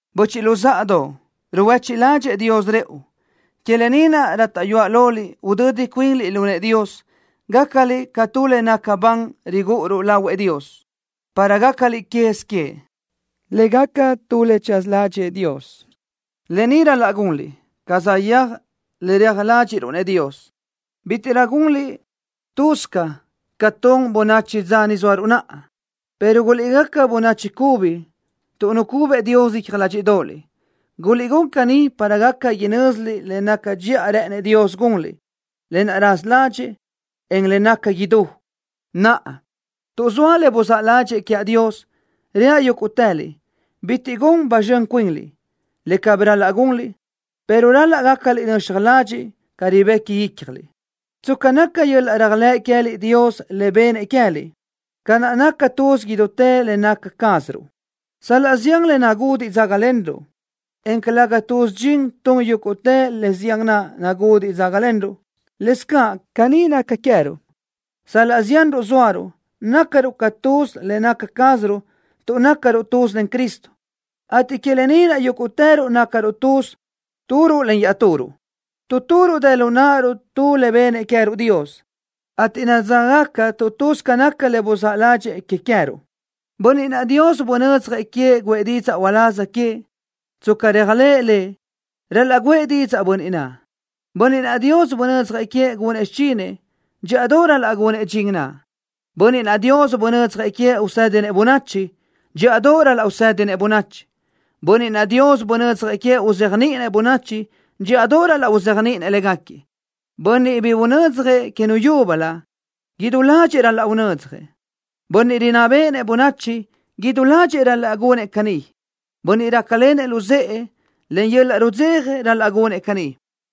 ¡Böchiʼ luzáʼadoʼ! ¡Ruhuéchiʼ ládxëʼë Dios rëʼu! Que lë ni naʼ rátaʼyuaʼ loliʼ udödi cuinliʼ lu nëʼë Dios, gácaliʼ ca tu le naca ban rigúʼuruʼ lahuëʼ Dios, para gácaliʼ quez queëʼ, le gaca tu le tsaza ládxëʼë Dios. Lë ni ral-laʼ gunliʼ, ca saʼyéaj le reaj ládxiʼruʼ-nëʼ Dios. Bítiʼrö gunliʼ laʼ lë́bisö ca tun bönachi dza ni zóaruʼ naʼa, pero guliʼgaca bönachi cubi tuʼ nucubëʼ Dios icja ládxiʼdoʼoliʼ. Guliʼgún caní para gaca inö́ziliʼ le naca dxiʼa rë́ʼënëʼ Dios gunliʼ, lë naʼ raza ládxëʼë, en le naca idú. Naʼa, tuʼ zoa le buzáʼ ládxëʼë quiaʼ Dios, reaʼ yúguʼtëliʼ: Bitiʼ gun ba zxön cuinliʼ, le cabí ral-laʼ gunliʼ, pero ral-laʼ gácaliʼ nöxaj ladxiʼ ca ribequi ícjaliʼ, tsca naca yöl-laʼ réajlëʼ queë́liʼ Dios le bennëʼ que queë́liʼ. Ca naʼ naca tuz idútë le naca cázaruʼ, sal-laʼ zián le nagudiʼ dzágalenruʼ, en calëga tuz dxin tun yúguʼtë le zián naʼ nagudiʼ dzágalenruʼ, lëscaʼ caní naca queë́ruʼ. Sal-laʼ zianruʼ zóaruʼ, nácaruʼ ca tuz le naca cázaruʼ tuʼ nácaruʼ tuz len Cristo, ateʼ que lë ni naʼ yúguʼtëruʼ nácaruʼ tuz turuʼ len iaʼturuʼ. Tu turuʼ dë lu náʼaruʼ tu le bennëʼ queë́ruʼ Dios, ateʼ nadzáʼgaca tu tu tsca naca le buzáʼ ládxëʼë que queë́ruʼ. Bönniʼ naʼ Dios bunödzjëʼ queëʼ guʼë didzaʼ uláz queëʼ, tsca réajlëʼë Lëʼ, ral-laʼ guʼë didzaʼ bönniʼ naʼ. Bönniʼ naʼ Dios bunödzjëʼ queëʼ gunëʼ xichinëʼ, dxíʼadoʼ ral-laʼ gunëʼ dxin naʼ. Bönniʼ naʼ Dios bunödzjëʼ queëʼ usédinëʼ bönachi, dxíʼadoʼ ral-laʼ usédinëʼ bönachi. Bönniʼ naʼ Dios bunödzjëʼ queëʼ uzéajniʼinëʼ bönachi, dxíʼadoʼ ral-laʼ uzéajniʼinëʼ légaquiëʼ. Bönniʼ bi unödzjëʼ que nu yúbölö, idú ládxëʼë ral-laʼ unödzjëʼ. Bönniʼ rinná béʼenëʼ bönachi, idú ládxëʼë ral-laʼ gunëʼ caní. Bönniʼ rácalenëʼ luzë́ʼë, len yöl-laʼ rudzeja ral-laʼ gunëʼ caní.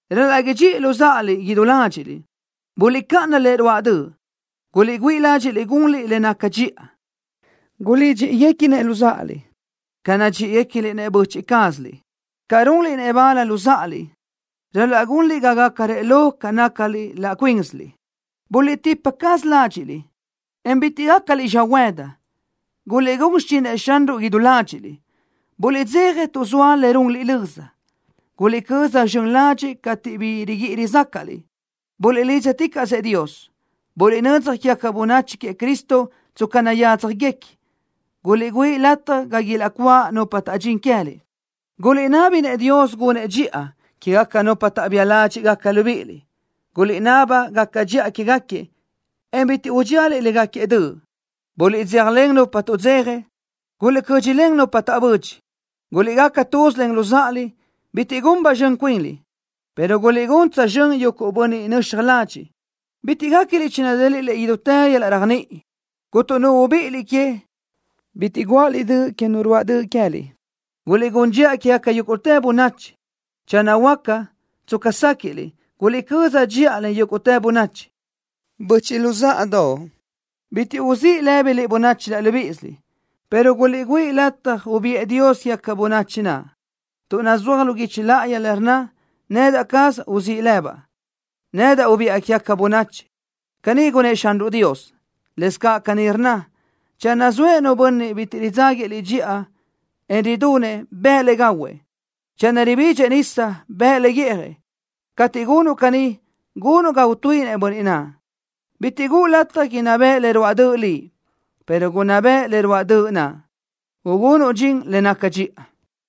Ral-laʼ idxíʼiliʼ luzáʼaliʼ idú ládxiʼliʼ. Buliʼcáʼana le ruáʼ döʼ. Guliʼgüíʼ ládxiʼliʼ gunliʼ le naca dxiʼa. Guliʼdxíʼi-guéquinëʼ luzáʼaliʼ ca nadxíʼiguecliʼ-nëʼ böchiʼ cázaliʼ. Ca runliʼ-nëʼ bal luzáʼaliʼ ral-laʼ gunliʼ ga gácarëʼ lo ca nácaliʼ laʼ cuínsiliʼ. Buliʼtípaticaʼsö ládxiʼliʼ, en bitiʼ gácaliʼ xöhuëdi. Guliʼgún xichinëʼ Xanruʼ idú ládxiʼliʼ. Buliʼdzeja tuʼ zoa le runliʼ löza. Guliʼcö́z zxön ladxiʼ cateʼ bi riguíʼi rizácaʼliʼ. Buliʼlídzaticaʼsëʼ Dios. Buliʼnödzaj quégaca bönachi queëʼ Cristo tsca nayádzjaguequinëʼ. Guliʼgüíʼ lataj ga ilaʼcuáʼ nupa taʼdxín queë́liʼ. Guliʼnábinëʼ Dios gunëʼ dxiʼa quégaca nupa taʼbía ládxiʼgaca libíʼiliʼ. Guliʼnaba gaca dxiʼa quégaquiëʼ, en bitiʼ udxíaliʼ légaquiëʼ döʼ. Buliʼdzéjalen nupa tuʼdzeja. Guliʼcö́dxilen nupa taʼbödxi. Guliʼgaca tuz len luzáʼaliʼ. Bitiʼ gun ba zxön cuinliʼ, pero guliʼgún tsözxö́n yuguʼ bönniʼ nöxaj ladxiʼ. Bitiʼ guéquiliʼ chinadéliʼliʼ idútë yöl-laʼ réajniʼi. Cuntu nu ubíʼiliʼ que, bitiʼ guáʼaliʼ döʼ que nu ruáʼ döʼ queë́liʼ. Guliʼgún dxiʼa quégaca yúguʼtë bönachi. Channö huáca, tsca séquiʼliʼ, guliʼcö́z dxiʼa len yúguʼtë bönachi. Böchiʼ luzáʼadoʼ, bitiʼ uzíʼ lë́biliʼ bönachi laʼ libíʼisiliʼ, pero guliʼgüíʼ lataj ubiʼë Dios quégaca bönachi naʼ, tuʼ nazúaj lu guichi láʼayi le rnna: Nedaʼ cazaʼ uzíʼ lëbaʼ. Nedaʼ ubiʼa quégaca bönachi. Caní gunnë́ʼ Xanruʼ Dios. Lëscaʼ caní rnna: Channö zoëʼ nu bönniʼ bitiʼ ridzáguiëʼ liʼ dxiʼa, en ridunëʼ, bëʼë le gahuëʼ. Channö ribidxëʼ nisa, bëʼë le guíʼjëʼ. Cateʼ gunuʼ caní, gunuʼ ga utuíʼinëʼ bönniʼ naʼ. Bitiʼ guʼu lataj inná beʼe le ruáʼ döʼ liʼ, pero gunná beʼe le ruáʼ döʼ naʼ, ugunuʼ dxin le naca dxiʼa.